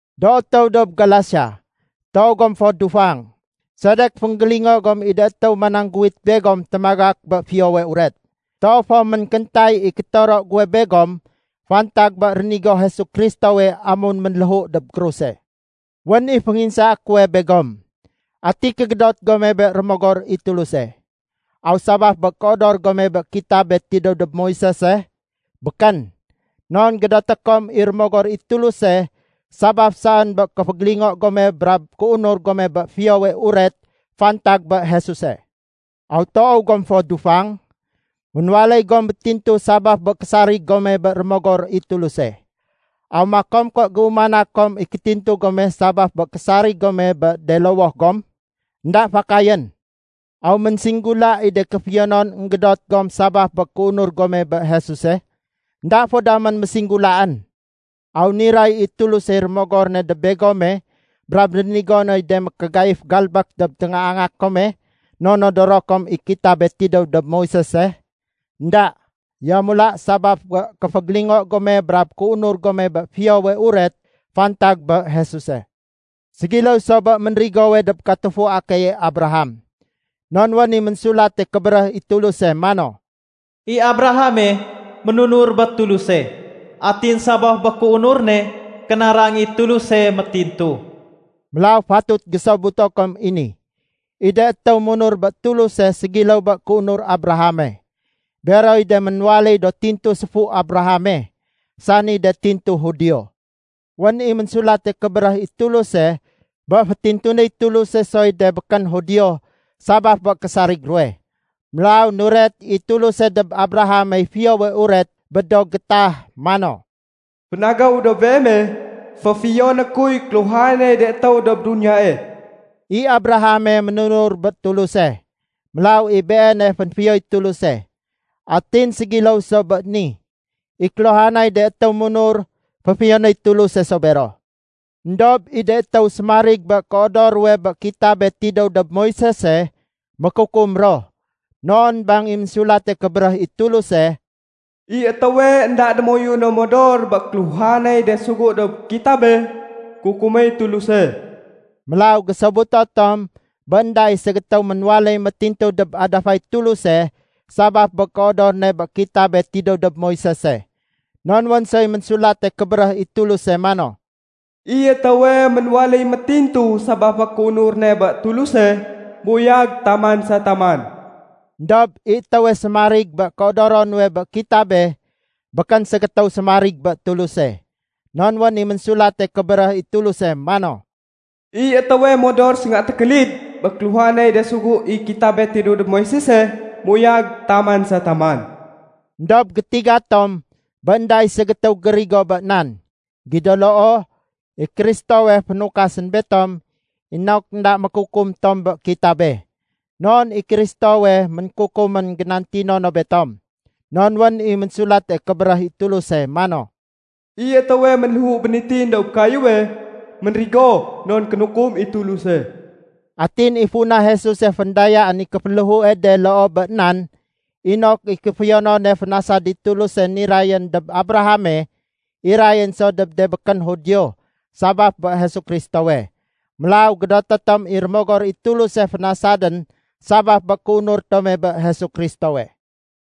Do étéw dob Galasia, toow gom fo dufang! Sedek fénggélingo gom i de étéw manangguwit begom témagak bé Fiyowe Uret? Toow fo ménkéntay i kétoro guwe begom fantag bé rénigo Jesu Kristowe amun ménléhu dob kruse. Wén i fénginsaé kuwe begom, ati kégédot gome bé Rémogor i Tuluse? Aw sabaf bé kéodor gome bé kitabe tidéw dob Moisese? Békén! Non gédoté kom i Rémogor i Tuluse sabaf saén bé kéfégélingo gome brab kéunur gome bé Fiyowe Uret fantag bé Jesuse. Aw toow gom fo dufang? Ménwaléy gom métintu sabaf bé késarig gome bé Rémogor i Tuluse. Aw makom ké géumana kom i kétintu gome sabaf bé késarig gome bé de lowoh gom? Enda fakayén! Aw ménsinggula i de kéfiyonon énggédot gom sabaf bé kéunur gome bé Jesuse? Enda fo damén mésinggulaén. Aw niray i Tulusey Rémogor ne dob begome brab rénigo noy de mékégaif galbék dob téngaanga kome non nodoro kom i kitabe tidéw dob Moisese? Enda! Yamula sabaf bé kéfégélingo gome brab kéunur gome bé Fiyowe Uret fantag bé Jesuse. Ségiléw so bé ménrigowe dob katufua keye Abraham. Non wén i Ménsulate Kébéréh i Tuluse mano, “I Abrahame, ménunur bé Tuluse. Atin sabaf bé kéunur ne, kénarang i Tuluse métintu.” Mélaw fatut gésobuto kom i ni: I de étéw munur bé Tuluse ségiléw bé kéunur Abrahame, beroy de ménwaléy do tintu séfu Abrahame, sani de tintu Judio. Wén i Ménsulate Kébéréh i Tuluse bé fétintunéy Tuluse soy de békén Judio sabaf bé késarig ruwe. Mélaw nuret i Tuluse dob Abrahamey Fiyowe Uret bé do gétah, mano, “Fénagéw dob beeme, féfiyoné kuy kéluhanay de étéw dob duniyae.” I Abrahame ménunur bé Tuluse, mélaw i beene fénfiyoy Tuluse. Atin ségiléw so bé ni, i kéluhanay de étéw munur, féfiyonéy Tuluse so bero. Endob i de étéw sémarig bé kéodoro ruwe bé kitabe tidéw dob Moisese, mékukum ro. Non bang i Ménsulate Kébéréh i Tuluse, “I étéwe énda démoyuno modor bé kéluhanay de sugu dob kitabe, kukuméy Tuluse.” Mélaw gésobuto tom bé énda i ségétéw ménwaléy métintu dob adafay Tuluse sabaf bé kéodor ne bé kitabe tidéw dob Moisese. Non wén soy Ménsulate Kébéréh i Tuluse mano, “I étéwe ménwaléy métintu sabaf bé kéunur ne bé Tuluse, méuyag taman sa taman.” Endob i étéwe sémarig bé kéodoro nuwe bé kitabe, békén ségétéw sémarig bé Tuluse. Non wén i Ménsulate Kébéréh i Tuluse mano, “I étéwe modor sénga tékélid bé kéluhanay de sugu i kitabe tidéw dob Moisese, méuyag taman sa taman.” Endob gétiga tom bé énda i ségétéw gérigo bé nan. Gido loo, i Kristowe fénukasén betom inok énda mékukum tom bé kitabe. Non i Kristowe ménkukumén génantino no betom. Non wén i Ménsulate Kébéréh i Tuluse mano, “I étéwe ménléhu bénitin dob kayéwe, ménrigo non kénukum i Tuluse.” Atin i funa Jesuse féndayaén i kéféléhue de loo bé nan, inok i kéfiyonone fénasad i Tuluse nirayén dob Abrahame, irayén so dob de békén Judio sabaf bé Jesu Kristowe. Mélaw gédoté tom i Rémogor i Tuluse fénasadén sabaf bé kéunur tome bé Jesu Kristowe.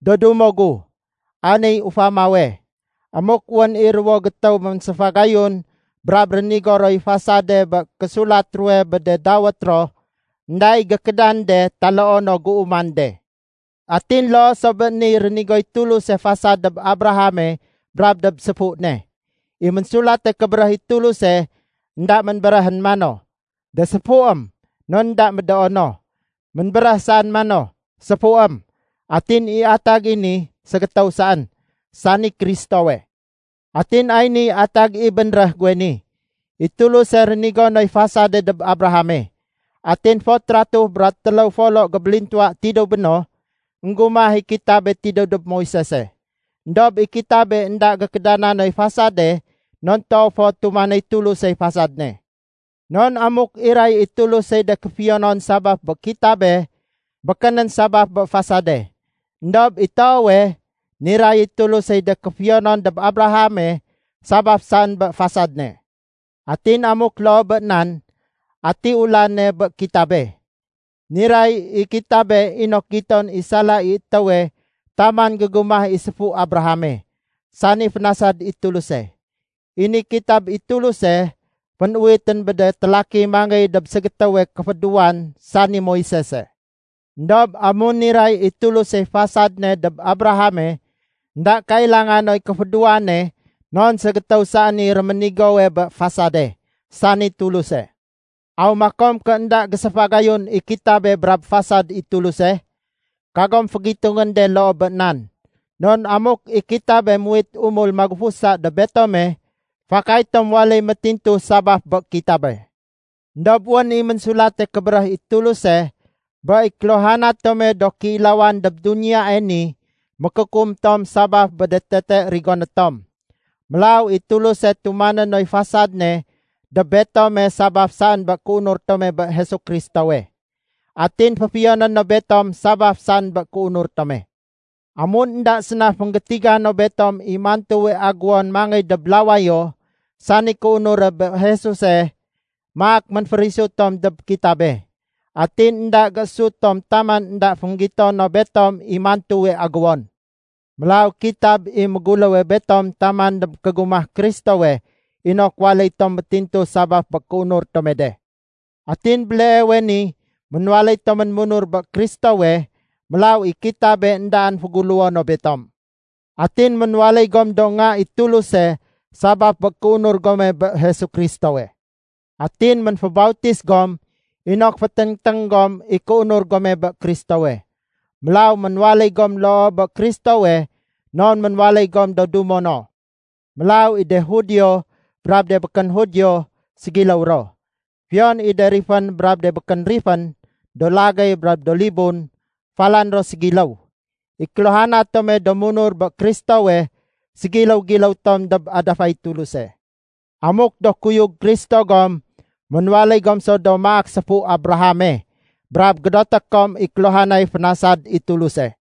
Do dumo gu, ay niy ufamawe. Amuk wén i ruwo gétéw ménséfagayun brab rénigo roy fasade bé késulat ruwe bé de dawét ro, énda i gékédan de taloo no géuman de. Atin loo so bé niy, rénigoy Tuluse fasad dob Abrahame brab dob séfu ne. I Ménsulate Kébéréh i Tuluse énda ménbéréhén mano, “de séfuém” non énda médoo no. Ménbéréh saén mano, “séfuém”, atin i atag i ni ségétéw saén, sani Kristowe. Atin ay niy atag i bénréh guwe ni. I Tuluse rénigo noy fasade dob Abrahame. Atin fot ratuh bra téléw folo gébélintuwa tidéw béno, énggumah i kitabe tidéw dob Moisese. Endob i kitabe énda gékédana noy fasade non toow fo tumanéy Tulusey fasad ne. Non amuk iray i Tulusey de kéfiyonon sabaf bé kitabe, békénén sabaf bé fasade. Endob i toowe, niray i Tulusey de kéfiyonon dob Abrahame sabaf saén bé fasad ne. Atin amuk loo bé nan, ati ulane bé kitabe? Niray i kitabe inok giton i sala i étéwe taman gégumah i séfu Abrahame, sani fénasad i Tuluse. I ni kitab i Tuluse, fénuwitén bé de télaki mangéy dob ségétéwe kéfédéwan sani Moisese. Endob amun niray i Tulusey fasad ne dob Abrahame énda kailanga noy kéfédéwane non ségétéw saén i réménigowe bé fasade, sani Tuluse. Aw makom ké énda géséfagayun i kitabe brab fasad i Tuluse? Kagom fégitungén de loo bé nan. Non amuk i kitabe muwit umul magufusa dob betome, fakay tom waléy métintu sabaf bé kitabe. Endob wén i Ménsulate Kébéréh i Tuluse bé i kéluhana tome do kéilawan dob duniyae ni mékukum tom sabaf bé de tete rigoné tom. Mélaw i Tuluse ténuma noy fasad ne dob betome sabaf saén bé kéunur tome bé Jesu Kristowe. Atin féfiyoné no betom sabaf saén bé kéunur tome. Amun énda séna fénggétiga no betom i mantuwe aguwon mangéy dob lawayo, sani kéunure bé Jesuse, maak ménférisu tom dob kitabe. Atin énda géésut tom taman énda fénggito no betom i mantuwe aguwon. Mélaw kitab i méguléw betom taman dob kégumah Kristowe inok waléy tom métintu sabaf bé kéunur tome de. Atin béleewe ni ménwaléy tomén munur bé Kristowe, mélaw i kitabe éndaén féguléwo no betom. Atin ménwaléy gom do nga i Tuluse sabaf bé kéunur gome bé Jesu Kristowe. Atin ménfébautis gom inok féténgténg gom i kéunur gome bé Kristowe. Mélaw ménwaléy gom loo bé Kristowe non ménwaléy gom do dumo no. Mélaw i de Judio brab de békén Judio, ségiléw ro. Fiyon i de rifén brab de békén rifén, do lagéy brab do libun, falan ro ségiléw. I kéluhana tome do munur bé Kristowe ségiléw-giléw tom dob adafay Tuluse. Amuk do kuyug Kristo gom, ménwaléy gom so do maak séfu Abrahame brab gédoté kom i kéluhanay fénasad i Tuluse.